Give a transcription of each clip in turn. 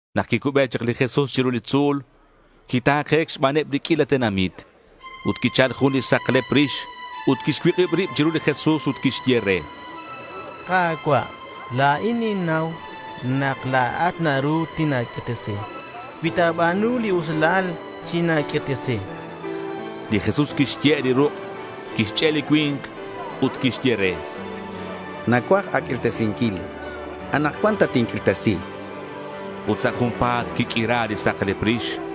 Nak quicube chak li Jesús chiru li tzu̱l, quita̱ke̱c xbaneb li q'uila tenamit. Ut quichal jun li saklep rix ut quixcuik'ib rib chiru li Jesús ut quixye re: —Ka̱cua', la̱in ninnau nak la̱at naru tina̱q'uirtesi. Cui ta̱ba̱nu li usilal, china̱q'uirtesi, chan. Li Jesús quixye' li ruk', quixch'e' li cui̱nk ut quixye re: —Nacuaj a̱q'uirtesinquil. Anakcuan tatinq'uirtesi, chan. Ut sa' junpa̱t quiq'uira li saklep rix.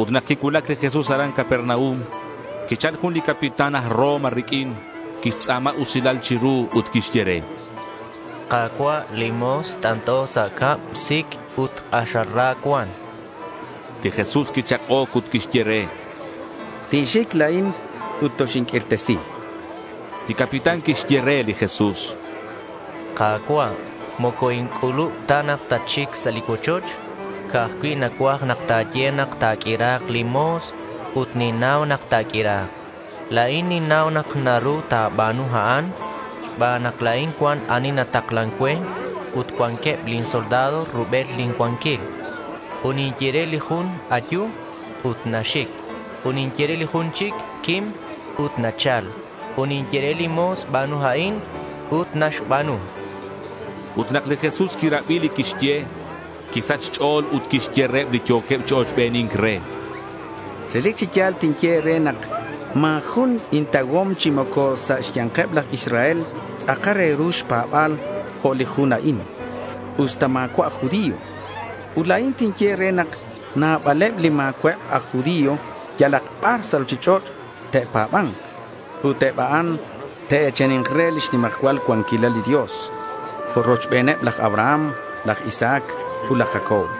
Ut nak quicuulac li Jesús aran Capernaum, quichal jun li capitán aj Roma riq'uin. Quixtz'a̱ma usilal chiru ut quixye re: —Ka̱cua', lin mo̱s t'ant'o sa' cab. Sic ut k'axal ra cuan, chan. Li Jesús quichak'oc ut quixye re: —Tinxic la̱in ut toxinq'uirtesi.— Li capitán quixye re li Jesús: —Ka̱cua', moco inc'ulub ta nak tatxic sa' li cuochoch. Ca'aj cui' nacuaj nak ta̱ye nak ta̱q'uira̱k lin mo̱s ut ninnau nak ta̱q'uira̱k. La̱in ninnau nak naru ta̱ba̱nu a'an xban nak la̱in cuan ani nataklan cue ut cuanqueb lin soldado rubel lin cuanquil. Ut ninye re li jun, “ayu” ut naxic. Ut ninye re li jun chic, “quim”, ut nachal. Ut ninye re lin mo̱s, “ba̱nu a'in”, ut naxba̱nu, chan li capitán. Ut nak li Jesús quirabi li quixye, quisach xch'o̱l ut quixye reheb li yo̱queb chi ochbeni̱nc re: —Relic chi ya̱l tinye e̱re nak ma̱ jun intauhom chi moco sa' xya̱nkeb laj Israel tz'akal re ru xpa̱ba̱l jo' li jun a'in, usta ma̱cua' aj judío. Ut la̱in tinye e̱re nak nabaleb li ma̱cua'eb aj judío yalak bar sa' ruchich'och' te'pa̱ba̱nk. Ut eb a'an te'e̱chani̱nk re lix nimajcual cuanquilal li Dios rochbeneb laj Abraham, laj Isaac, ut laj Jacob.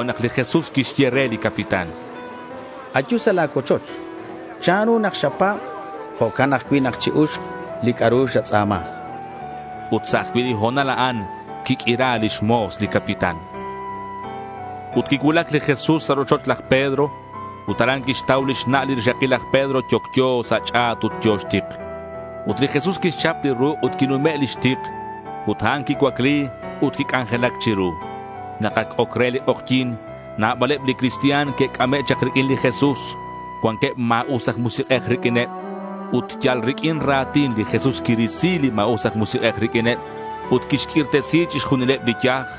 Tojo'nak li Jesús quixye re li capitán: —Ayu sa' la̱ cuochoch. Chanru nak xapa̱b, jo'can ajcui' nak chi-uxk li c'a'ru xatz'a̱ma, chan. Ut sa' ajcui' li ho̱nal a'an quiq'uira lix mo̱s li capitán. Ut quicuulac li Jesús sa' rochoch laj Pedro. Ut aran quixtau lix na' li rixakil laj Pedro yocyo sa' xch'a̱t ut yo̱ xtik. Ut li Jesús quixchap li ruk' ut quinume' lix tik. Ut a'an quicuacli, ut quic'anjelac chiru. Nak ac oc re li k'ojyi̱n, nabaleb li cristian que'c'ame' chak riq'uin li Jesús. Cuanqueb ma̱us aj musik'ej riq'uineb. Ut yal riq'uin ra̱tin, li Jesús quirisi li ma̱us aj musik'ej riq'uineb, ut quixq'uirtesi chixjunileb li yaj.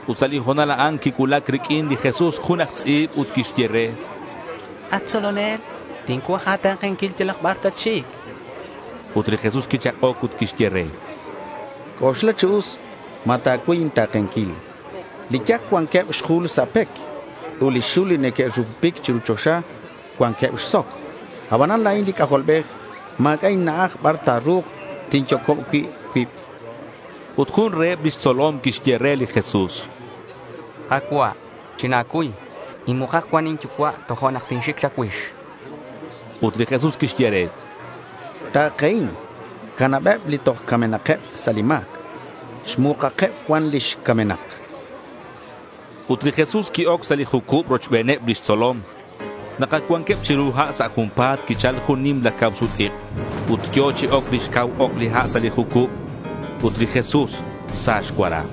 Ut sa' li ho̱nal a'an quicuulac riq'uin li Jesús jun aj tz'i̱b ut quixye re: —At tzolonel, tincuaj a̱ta̱kenquil yalak bar tatxic, chan re. Ut li Jesús quichak'oc ut quixye re: —C'oxla chi us ma ta̱cuy inta̱kenquil. Li yac cuanqueb xjul sa' pec, ut li xul li neque'rupupic chiru choxa cuanqueb xsoc, abanan la̱in li C'ajolbej ma̱c'a' inna'aj bar ta̱ru̱k tinyocob cui' cuib, chan. Ut jun reheb lix tzolom quixye re li Jesús: —Ka̱cua', china̱cuy. Inmukak cuan inyucua' tojo'nak tinxic cha̱cuix, chan. Ut li Jesús quixye re: —Ta̱kehin, canabeb li toj camenakeb sa' li ma̱c xmukakeb cuan lix camenak, chan re. Ut li Jesús qui-oc sa' li jucub rochbeneb lix tzolom. Nak ac cuanqueb chiru ha', sa' junpa̱t quichal jun li nimla cak-sut-ik'. Ut yo̱ chi oc lix cau ok li ha' sa' li jucub. Ut li Jesús sa xcuara.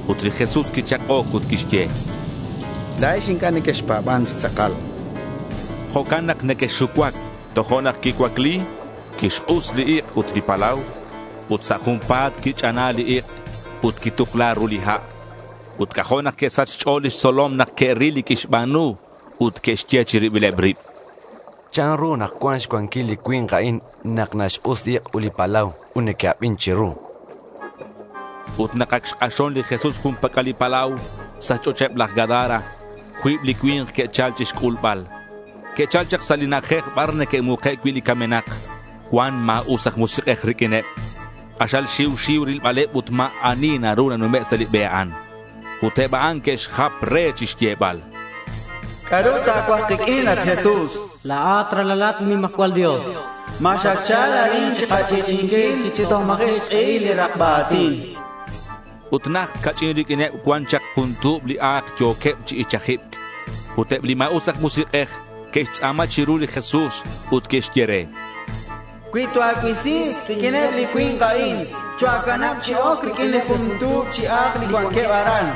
Ut li Jesús quichak'oc ut quixye: —La̱ex inc'a' nequexpa̱ban chi tz'akal. Jo'can nak nequexxucuac, chan reheb. Tojo'nak quicuacli, quixk'us li ik', ut li palau, ut sa' junpa̱t quich'ana li ik' ut quitukla ru li ha'. Ut c'ajo' nak que'sach xch'o̱l lix tzolom nak que'ril li quixba̱nu ut que'xye chi ribileb rib: —¿Chanru nak cuan xcuanquil li cui̱nk a'in nak naxk'us li ik' ut li palau ut neque'abin chiru? chanqueb. Ut nak ac xk'axon li Jesús jun pac'al li palau sa' xch'och'eb laj Gadara, cuib li cui̱nk que'chal chixc'ulbal. Que'chal chak sa' li na'ajej bar neque'muke' cui' li camenak. Cuan ma̱us aj musik'ej riq'uineb. K'axal xiu xiu rilbaleb ut ma̱ ani naru nanume' sa' li be a'an. Ut eb a'an que'xjap re chixyebal: —¿C'a'ru ta̱cuaj kiq'uin, at Jesús? La̱at ralalat li nimajcual Dios. ¿Ma xatchal arin chikach'i'ch'i'inquil chi toj ma̱ji' xk'ehil li rakba a̱tin? chanqueb. Ut najt ca'ch'in riq'uineb cuan chak jun tu̱b li a̱k, yo̱queb chi ichajibc. Ut eb li ma̱us aj musik'ej que'xtz'a̱ma chiru li Jesús ut que'xye re: —Cui toa̱cuisi riq'uineb li cui̱nk a'in, choa̱canab chi oc riq'uineb li jun tu̱b chi a̱k li cuanqueb aran.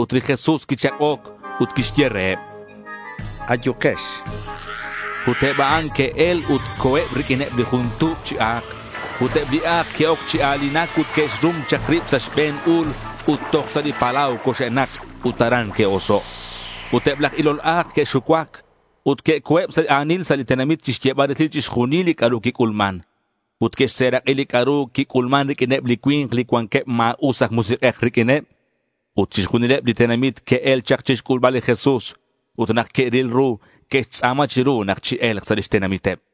Ut li Jesús quichak'oc ut quixye reheb: —Ayukex. Ut eb a'an que'el ut co̱eb riq'uineb li jun tu̱b chi a̱k. Ut eb li a̱k que'oc chi a̱linac ut que'xrum chak rib sa' xbe̱n u̱l ut toj sa' li palau coxe'nak ut aran que'oso'. Ut eb laj ilol a̱k que'xucuac ut que'co̱eb sa' a̱nil sa' li tenamit chixyebal resil chixjunil li c'a'ru quic'ulman. Ut que'xserak'i li c'a'ru quic'ulman riq'uineb li cui̱nk li cuanqueb ma̱us aj musik'ej riq'uineb. Ut chixjunileb li tenamit que'el chak chixc'ulbal li Jesús. Ut nak que'ril ru, que'xtz'a̱ma chiru nak chie̱lk sa' lix tenamiteb.